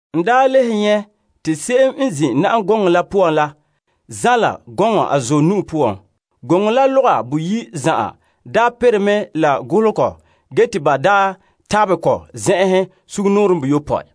N le nyɛ' te se'em n zin' na'am gɔŋɔ la poan la zanla gɔŋɔ a zuɔ nu'o poan. Ganɛ la loga ayi' la zan'an perɛ mɛ la golehegɔ ge te ba dekɛ sɛla n tabɛre tabɛ kɔ zen'enhen seyopɔe.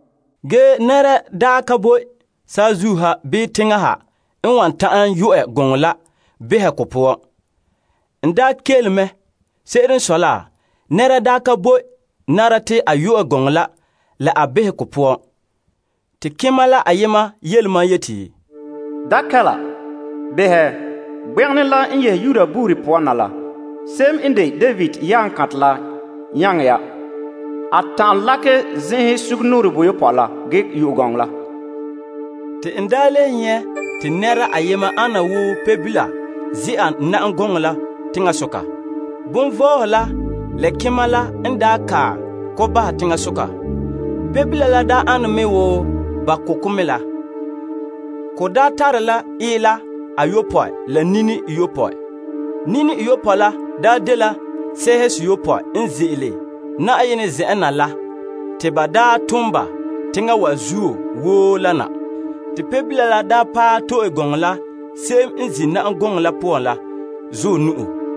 Ge nɛra ka boe saazuo ha bii teŋa ha n wan ta'an yu'ɛ ganɛ la behɛ ko poan. N daa kele. Se'ere n sɔe la, nɛra daa ka boe nara te a yu'ɛ ganɛ la la a behɛ ko poan. Te kema la ayema yele mam yeti, Da kɛla. Behɛ, Gbegenɛ la n yehe Yuda buuri poan na la, se'em n de David yaaŋa kantɛ la n nyaŋɛ ya. A ta'an lakɛ zen'enhen seyopɔe la ge yu'ɛ ganɛ la. Te n le nyɛ' te nɛra ayema ane wo Pebila ze'a na'am gɔŋɔ la teŋasoka. Kelompagehedoma la la kema la n kae ko bahɛ teŋasoka. Pebila la ane me wo ba ko' kɔ mɛ la. Ko tare la ila ayopɔe la nini iyopɔe. Nini iyopɔe la dela sɛɛhe seyopɔe n ze'ele Yenɛ zen'en na la te ba daa tom ba teŋa wa zuo woo la na. Te Pebila la paɛ to'e ganɛ la se'em n zin' na'am gɔŋɔ la poan la zuɔ nu'o.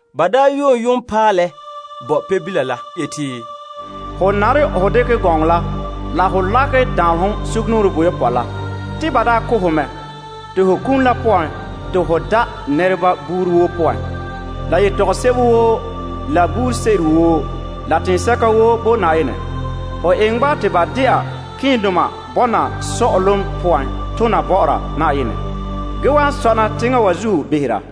Ba yoon yoonpaalɛ bo Pebila yeti, Ho nare ho dekɛ ganɛ lakɛ sɛla te ba tabɛ sugumnɔɔren boyopɔe la. Te ba daa ko' ho mɛ, te kum la poan te ho da' buuri woo, la yetɔgom woo, la nɛreba woo, la teŋhe woo bo Yenɛ. Ho eŋɛ ba te ba dɛna malemadoma buuri tona bɔ'ɔra Yenɛ, ge wan sɔna teŋa wa zuo behera.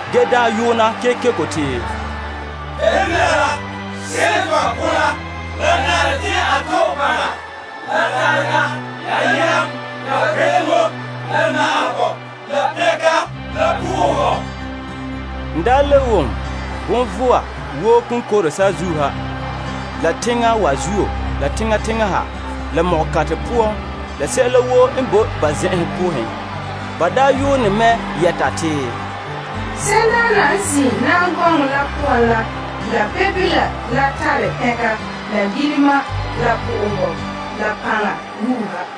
ge yoona kekeko te, Pebila la se'em te ba ko' la, la nare te a to'e paŋa, la tarega, la yam, la kpe'eŋo, la na'ahegɔ, la soŋa, la pɛnka. N le wom bonvɔa woo n boe saazuo ha, la teŋa wa zuo, la teŋa teŋa ha, la ko'kanra poan, la sɛla woo n boe ba poan konkore te ba yuune yeti, Se'emdaana n zin' na'am gɔŋɔ la poan la, la Pebila la tare pɛnka, la na'ahegɔ, la soŋa, la paŋa wuuha.